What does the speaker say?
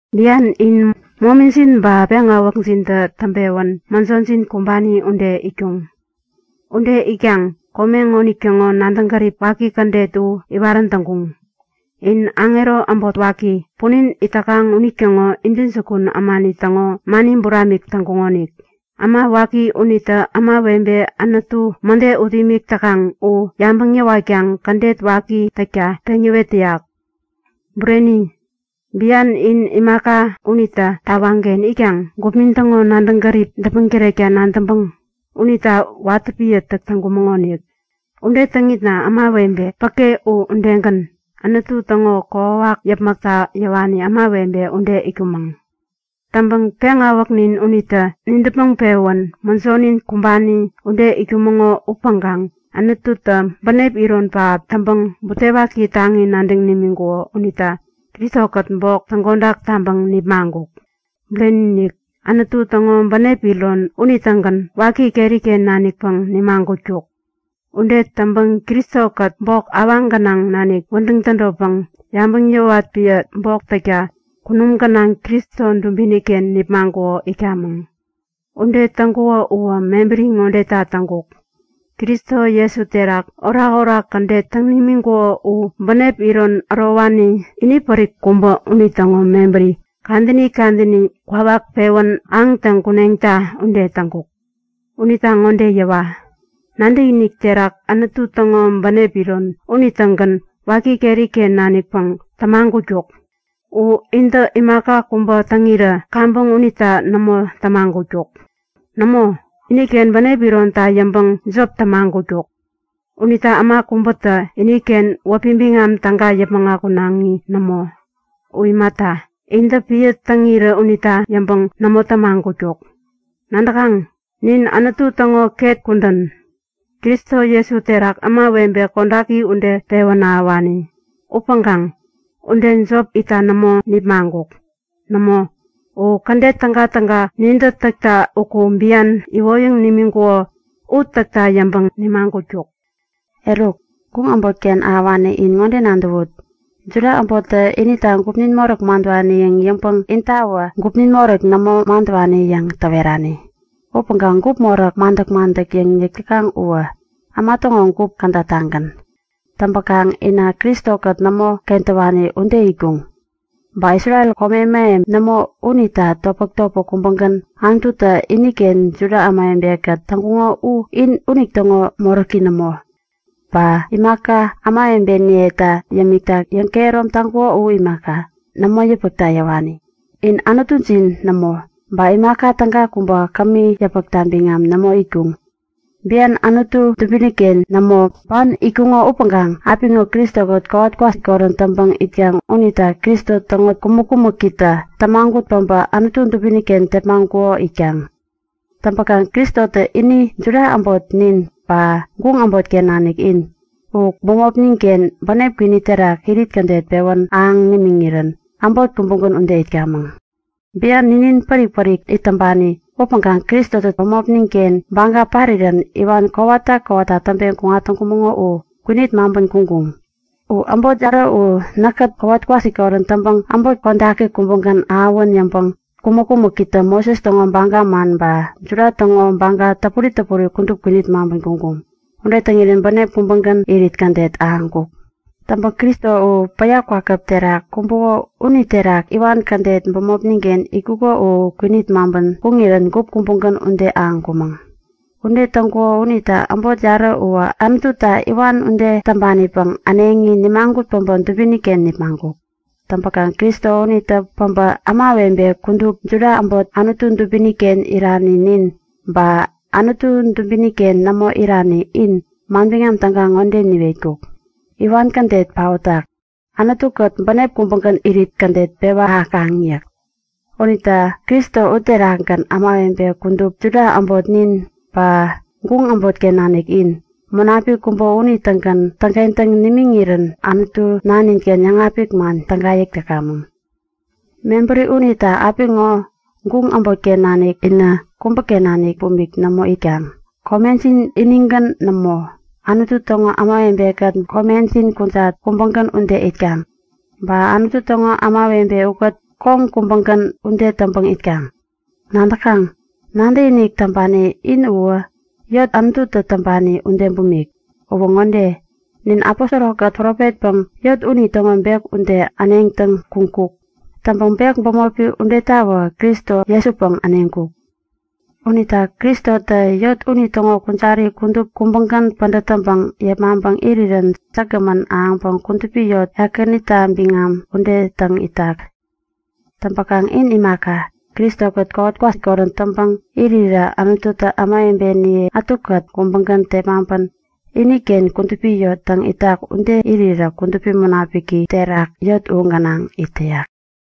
Bian in momijin ba peŋawäkjintä täŋpewän mäjojin kumbani ude itkuŋ. Ude itkaŋ kome ŋonitäŋo nadäŋ gärip waki kädet u iwarän täŋkuŋ. In aŋero äbot waki, punin it täkaŋ unitäŋo intäjukun ämani täŋo mani buramik täŋkuŋonik. Äma waki unitä ämawebe Anutu mäde ut imik täkaŋ u yabäŋ yäwatkaŋ kädet waki täkta peŋyäwet täyak. Bureni, bian nin imaka, unitä tawaŋken itkaŋ gupnin täŋo nadäŋ gärip däpmäŋ tärekta nadäŋpäŋ unita watä piä täk täŋkumäŋonik. Ude täŋitna ämawebe päke u udegän, Anutu täŋo kokwawak yäpmäkta yäwani ämawebe ude itkumäŋ. Täŋpäŋ peŋawäknin unitä nidäpmäŋ-pewän mäjonin kumbani ude itkumäŋo upäŋkaŋ Anututä bänep iron pähap täŋpäŋ, butewaki taŋi nadäŋ nimiŋkuko unita Kristo-kät bok täŋkodak taŋpäŋ nipmaŋkuk. Bureni-inik! Anutu täŋo bänep iron unitägän waki keri-ken nanikpäŋ nimagutkuk. Ude täŋpäŋ Kristo-kät bok awaŋ gänaŋ nanik wädäŋ tädotpäŋ yabäŋ yäwat piä bok täkta kunum gänaŋ Kristo dubini-ken nipmaŋkuko itkamäŋ. Ude täŋkuko uwä mebäri ŋodeta täŋkuk; Kristo Jesu terak orakorak kädet täŋ nimiŋkuko u bänep ironi ärowani inipärik kubä unitäŋo mebäri kadäni kadäni kwawak pewän ahäŋtäŋ kuneŋta ude täŋkuk. Unita ŋode yäwa; Nadäkinik terak Anutu täŋo bänep iron unitägän waki keri-ken nanikpäŋ tämagutkuk. U intä imaka kubä täŋirä kaŋpäŋ unita nämo tämagutkuk. Nämo, iniken bänep ironta yäŋpäŋ jop tämagutkuk. Unita äma kubätä iniken wäpi biŋam täga yäpmäŋ akunaŋi nämo. U imata, intä piä täŋirä unita yäŋpäŋ nämo tämagutkuk. Nadäkaŋ? Nin Anutu täŋo ket kudän, Kristo Jesu terak ämawebe kodaki ude pewän ahäwani. Upäŋkaŋ ude jop itta nämo nipmaŋkuk. Nämo, u kädet tägatäga nintä täkta uku bian iwoyäŋ nimiŋkuko u täkta yäŋpäŋ nimagutkuk. Eruk, guŋ äbotken ahäwani in ŋode nadäwut; Juda äbottä inita gupnin moräk madäwani yäŋ yäŋpäŋ intawä gupjin moräk nämo madäwani yäŋ täwerani. (Upäŋkaŋ gup moräk madäk-madäkta yäk täkaŋ uwä äma täŋo gup kädatagän.) Täŋpäkaŋ inä Kristo-kät nämo kentäwani ude itkuŋ. Ba Isrel kome mähem nämo unita topmäk-topmäk kubägän Anututä iniken Juda ämawebe-kät täŋkuko u in unitäŋo moräki nämo. Ba imaka ämawebeniyeta yämikta yäŋkehärom taŋkuko u imaka, nämo yäpmäkta yäwani. In Anutujin nämo, ba imaka täga kubä kämi yäpmäkta biŋam nämo itkuŋ. Bian, Anutu dubini-ken nämo, ban itkuŋo upäŋkaŋ apiŋo Kristo-kät kowat kwasikorän täŋpäŋ itkaŋ unita Kristo täŋo kumäk-kumäkitä tämagut pabä Anutu dubini-ken tepmaŋkuko itkaŋ. Täŋkaŋ Kristotä ini Juda äbot nin, ba guŋ äbotken nanik in, u bämopnin-ken bänep kwini terak irit kädet pewän ahäŋ nimiŋirän äbot kubägän ude itkamäŋ. Bian ninin pärik-pärik it täŋpani upäŋkaŋ Kristotä bämopnin-ken baga parirän iwan kowata kowata täŋpeŋ kuŋatkumäŋo u kwinit maŋpän kuŋkuŋ. U äbot yarä u näkkät kowat kwasikorän täŋpäŋ äbot kodaki kubägän ahäwän yäŋpäŋ kumäk-kumäkitä Moses täŋo baga man ba Juda täŋo baga täpuri täpuri kudup kwinit täŋpän kuŋkuŋ. Ude täŋirän bänep kubägän irit kädet ahäŋkuk. Täŋpäŋ Kristo u, päya kwakäp terak kumbuko uniterak iwan kädet bämopnin-ken itkuko u kwinit täŋpän kuŋirän gup kubägän ude ahäŋkumäŋ. Ude täŋkuko unita äbot yarä uwä Anututa iwan ude täŋpanipäŋ äneŋi nimagut päbä dubini-ken nipmaŋkuk. Täŋpäkaŋ Kristo unitä päbä ämawebe kudup, Juda äbot Anutu dubini-ken irani nin, ba Anutu dubini-ken nämo irani in manbiŋam täga ŋode niwetkuk; Iwan kädet paotak. Anutu-kät bänep kubägän irit kädet pewa ahäkaŋ yäk. Unita Kristo uterakgän ämawebe kudup, Juda äbot nin, ba guŋ äbotken nanik in, Munapik kubä unitägän täŋkentäŋ nimiŋirän Anutu nanin-ken yäŋapik man täga yäk täkamäŋ. Mebäri unita apiŋo guŋ äbotken nanik inä kubäken nanik bumik nämo itkaŋ. Komejin inigän nämo, Anutu täŋo kudupi ämawebe-kät komejin kujat kubägän ude itkaŋ. Ba Anutu täŋo kudupi ämawebe ukät koŋ kubägän ude täŋpäŋ itkaŋ. Nadäkaŋ? Nadäkinik täŋpani in uwä eŋi Anututä täŋpani ude bumik. Uwä ŋode; Nin aposoro-kät profetpäŋ eŋi unitäŋo bek ude äneŋtäŋ kuŋkuk. Täŋkaŋ bek bämopi udetawä Kristo Jesupäŋ äneŋkuk. Unita Kristotä eŋi unitäŋo kujari kudup kubägän pädät täŋpäŋ yepmaŋ irirän säkgämän ahäŋpäŋ kudupi yot, Ekänita biŋam ude täŋ itak. Täŋpäkaŋ in imaka, Kristo-kät kowat kwasikorän täŋpäŋ irirä Anututä ämawebeniye ätukät kubägän tepmaŋpän iniken kudupi yot täŋ itak ude irirä Kudupi Munapiki terak eŋi u gänaŋ it täyak.